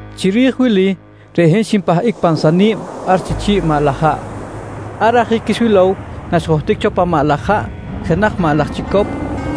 Chiri̱j wili, reꞌ hin xinpahꞌic pan sani̱b ar chi chi̱ꞌ maꞌ laj haꞌ. Ar ajic xwilow naxjohtic cho pan maꞌ laj haꞌ jenaj maꞌ laj chicop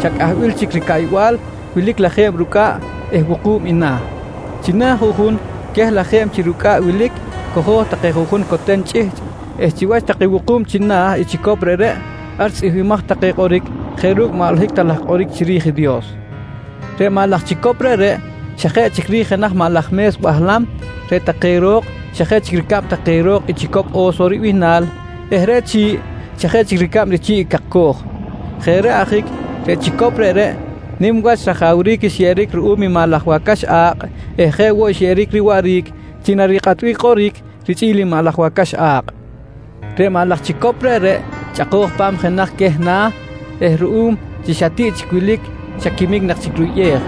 xa cꞌahbil chic ricaꞌybal wilic lajeb rucꞌaꞌ eh wuku̱b i na̱. China̱ juꞌjun queh lajeb chi rucꞌaꞌ wilic cojo̱j take juꞌjun coten chꞌihchꞌ eh chiwach take wuku̱b china̱ i chicop reꞌreꞌ, ar tzꞌihmbimaj take kꞌoric jeꞌ ru̱cꞌ maꞌ holohic ta laj kꞌoric chiri̱j i Dios. Reꞌ maꞌ laj chicop reꞌreꞌ xa jeꞌ chic ri̱j jenaj maꞌ laj me̱s bahlam, reꞌ take ro̱k xa jeꞌ chic ricab take ro̱k i chicop “Oso” ribihnal eh reꞌ chi̱ꞌ xa jeꞌ chic ricab chi̱ꞌ i cakcoj. Jeꞌ reꞌ ajic, reꞌ chicop reꞌreꞌ nim wach rajawric xyeꞌeric ruꞌum i maꞌ laj wacax a̱kꞌ eh jeꞌ woꞌ xyeꞌeric riwaꞌric chi narikꞌatbic kꞌoric richꞌi̱l i maꞌ laj wacax a̱kꞌ. Reꞌ maꞌ laj chicop reꞌreꞌ chꞌako̱j pa̱m i jenaj queh na̱ eh ruꞌum chi xa tiꞌ chic wilic xa quimic nak chic ruyꞌej,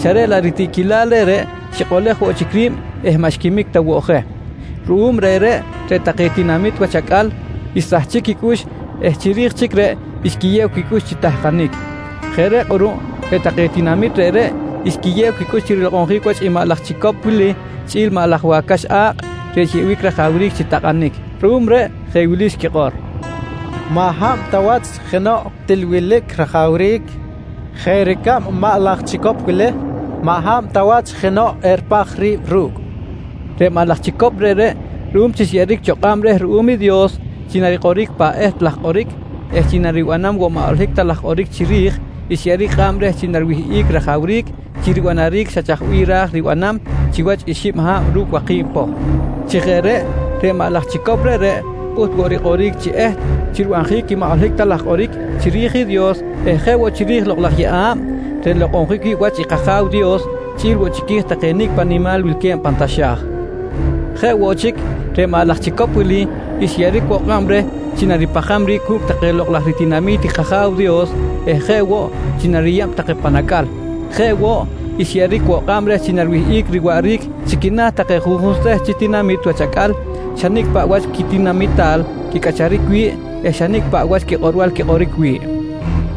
xa reꞌ laꞌ reꞌ ritiꞌquilal reꞌreꞌ xikꞌolej woꞌ chic ri̱b eh maꞌ xquimic ta woꞌ je. Ruꞌum reꞌreꞌ, reꞌ take tinamit wach acꞌal xsahchic quicꞌux eh chiri̱j chic reꞌ xquiyew quicꞌux chi tahkanic. Jeꞌ reꞌ kꞌuruꞌ reꞌ take tinamit reꞌreꞌ xquiyew quicꞌux chi rilokꞌonjic wach i maꞌ laj chicop wili chꞌi̱l i maꞌ laj wacax a̱kꞌ reꞌ xyeꞌbic rajawric chi takꞌanic. Ruꞌum reꞌ jeꞌ wili xquikꞌor: «Maꞌ hab ta wach jenoꞌ til wilic rajawric jeꞌ ricab i maꞌ laj chicop wili! Maꞌ hab ta wach jenoꞌ eripaj ri̱b ru̱cꞌ! nqui take. Reꞌ maꞌ laj chicop reꞌreꞌ ruꞌum chi xyeꞌeric woꞌ kꞌab reh ruꞌum i Dios chi narikꞌoric pan eht laj kꞌoric eh chi naribanam woꞌ maꞌ holohic ta laj kꞌoric chiri̱j, xyeꞌeric kꞌab reh chi nariwihꞌic rajawric chi ribanaric xa chaj bih ra̱j ribanam chiwach i xib ha̱b ru̱cꞌ waki̱b poh. Chi jeꞌ reꞌ, reꞌ maꞌ laj chicop reꞌreꞌ pꞌuht woꞌ rikꞌoric chi eht chi ribanjic i maꞌ holohic ta laj kꞌoric chiri̱j i Dios eh jeꞌ woꞌ chiri̱j i Lokꞌ laj Yeꞌa̱b reꞌ nlokꞌonjic wi̱ꞌ wach i kAja̱w Dios chꞌi̱l woꞌ chiqui̱j take nicꞌ paꞌ nimal wilque̱b pan taxa̱j. Jeꞌ woꞌ chic, reꞌ maꞌ laj chicop wili xyeꞌeric woꞌ kꞌab reh chi naripajam ri̱b cu̱cꞌ take lokꞌ laj ritinami̱t i kAja̱w Dios eh jeꞌ woꞌ chi nariyeb take pan acꞌal. Jeꞌ woꞌ xyeꞌeric woꞌ kꞌab reh chi nariwihꞌic riwaꞌric chi quina̱ take juꞌjun seht chi tinamit wach acꞌal xa nicꞌ paꞌ wach quitinamital quicꞌacharic wi̱ꞌ eh xa nicꞌ paꞌ wach quikꞌorbal quikꞌoric wi̱ꞌ.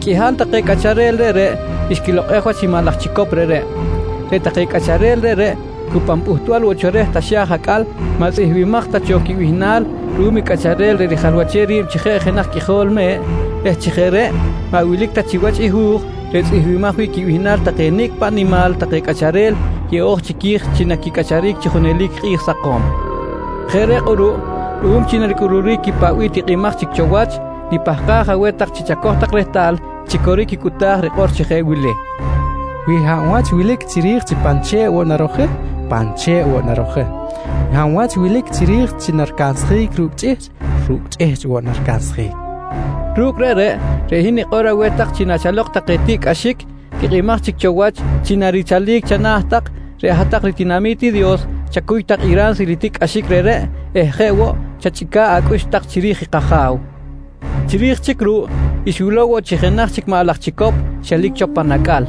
Qꞌuihal queh take cꞌacharel reꞌreꞌ, xquilokꞌej wach i maꞌ laj chicop reꞌreꞌ. Reꞌ take cꞌacharel reꞌreꞌ cu pan pꞌuhtbal cho reh taxa̱j acꞌal maꞌ tzꞌihmbimaj ta cho quibihnal ruꞌum i Cꞌacharel reꞌ rijalwachem ri̱b chi jeꞌ jenaj Qꞌuijol Me̱ꞌ eh chi jeꞌ reꞌ maꞌ wilic ta chiwach i hu̱j reꞌ ritzꞌihmbaj wi̱ꞌ quibihnal take nicꞌ paꞌ nimal take cꞌacharel yeꞌo̱j chiqui̱j chi naquicꞌacharic chi junelic kꞌi̱j sakom. Jeꞌ reꞌ kꞌuruꞌ ruꞌum chi naricꞌuluric i paꞌ bih tikꞌimaj chic cho wach, nipahkaj aweh tak chi chacoj tak rehtal chi coric i cꞌuta̱j rikꞌor chi jeꞌ wili: “Wi hab wach wilic chic chiri̱j chi narojic pan che̱ꞌ, reꞌreꞌ pan che̱ꞌ woꞌ narojic. Hab wach wilic chic chiri̱j chi naricansjic ru̱cꞌ chꞌihchꞌ, ru̱cꞌ woꞌ chꞌihchꞌ naricansjic, nqui rikꞌor i kꞌoric reꞌreꞌ. Ru̱cꞌ reꞌreꞌ, reꞌ hin nikꞌor aweh tak chi nachalok take tiꞌcꞌaxic tikꞌimaj chic cho wach chi narichalic chana̱ tak, reꞌ hat-tak ritinami̱t i Dios chacuy tak i ransil i tiꞌcꞌaxic reꞌreꞌ eh jeꞌ woꞌ chachꞌica̱ꞌ acꞌux tak chiri̱j i kAja̱w. Chiri̱j chic ruꞌ, xwilow woꞌ chi jenaj chic maꞌ laj chicop xelic cho pan acꞌal.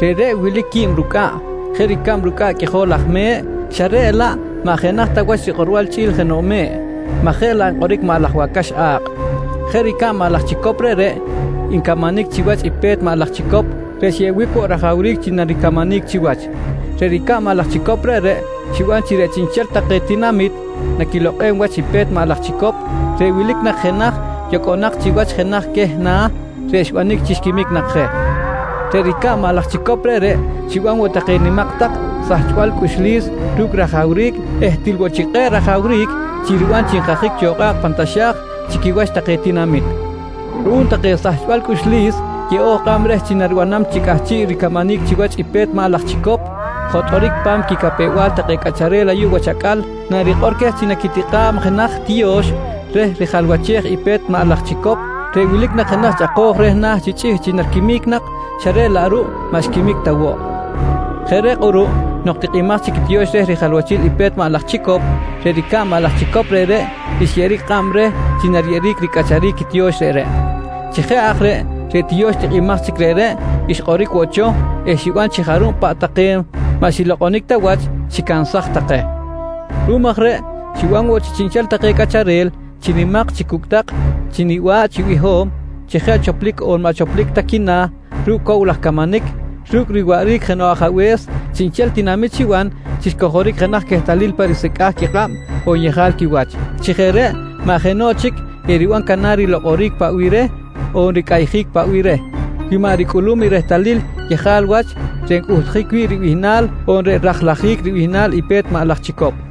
Reꞌreꞌ wilic quib rucꞌaꞌ jeꞌ ricab rucꞌaꞌ qꞌuijol laj me̱ꞌ, xa reꞌ laꞌ maꞌ jenaj ta wach rikꞌorbal chꞌi̱l jenoꞌ me̱ꞌ maj jeꞌ laꞌ nkꞌoric maꞌ laj wacax a̱kꞌ. Reꞌ ricab maꞌ laj chicop reꞌreꞌ ncamanic chiwach i pe̱t maꞌ laj chicop reꞌ xyeꞌbic woꞌ rajawric chi naricamanic chiwach. Reꞌ ricab maꞌ laj chicop reꞌreꞌ xiban chi reꞌ chiꞌnchel take tinamit naquilokꞌem wach i pe̱t maꞌ laj chicop reꞌ wilic nak jenaj yocꞌonak chiwach jenaj queh na̱, reꞌ xbanic chi xquimic nak je. Reꞌ ricab maꞌ laj chicop reꞌreꞌ xiban woꞌ take nimak tak sahchbal cꞌuxlis ru̱cꞌ rajawric eh til woꞌ chic kꞌe̱ꞌ rajawric chi riban chi nkajic cho kꞌa̱kꞌ pan taxa̱j chi quiwach take tinamit. Ruꞌum take sahchbal cꞌuxlis yeꞌo̱j kꞌab reh chi naribanam chi cꞌahchiꞌ ricamanic chiwach i pe̱t maꞌ laj chicop, jotꞌoric pa̱m quicapew-bal take cꞌacharel ayuꞌ wach acꞌal narikꞌor queh chi naquitikꞌa̱b jenaj tiyo̱x reꞌ rijalwachej i pe̱t maꞌ laj chicop reꞌ wilic nak jenaj chꞌako̱j reh na̱ chi chꞌihchꞌ chi nariquimic nak xa reꞌ laꞌ ruꞌ maꞌ xquimic ta woꞌ. Jeꞌ reꞌ kꞌuruꞌ nok tikꞌimaj chic i tiyo̱x reꞌ rijalwachil i pe̱t maꞌ laj chicop, reꞌ ricab maꞌ laj chicop reꞌreꞌ xyeꞌeric kꞌab reh chi nariyeb ricꞌacharic i tiyo̱x reꞌreꞌ. Chi jeꞌ aj reꞌ, reꞌ tiyo̱x tikꞌimaj reꞌreꞌ xkꞌoric woꞌ cho eh xiban chi jarub paꞌ take maꞌ xilokꞌonic ta wach xicansaj take. Ruꞌum aj reꞌ xiban woꞌ chi chiꞌnchel take cꞌacharel, chi nimak chi cucꞌtak, chi niba̱ꞌ chi biho̱m, chi jeꞌ choplic on maꞌ choplic quina̱ ru̱cꞌ cow laj camanic ru̱cꞌ riwaꞌric jenoꞌ ajabe̱s, chiꞌnchel tinamit xiban chi xcojoric jenaj quehtalil pa risecꞌa̱j quikꞌab on yejal quiwach. Chi jeꞌ reꞌ maꞌ jenoꞌ chic eriban canar rilokꞌoric paꞌ bih reh on ricꞌayjic paꞌ bih reh wi maꞌ ricꞌulum i rehtalil yejal wach reꞌ ncꞌuhtjic wi̱ꞌ ribihnal on reꞌ rajlajic ri̱j ribihnal i pe̱t maꞌ laj chicop.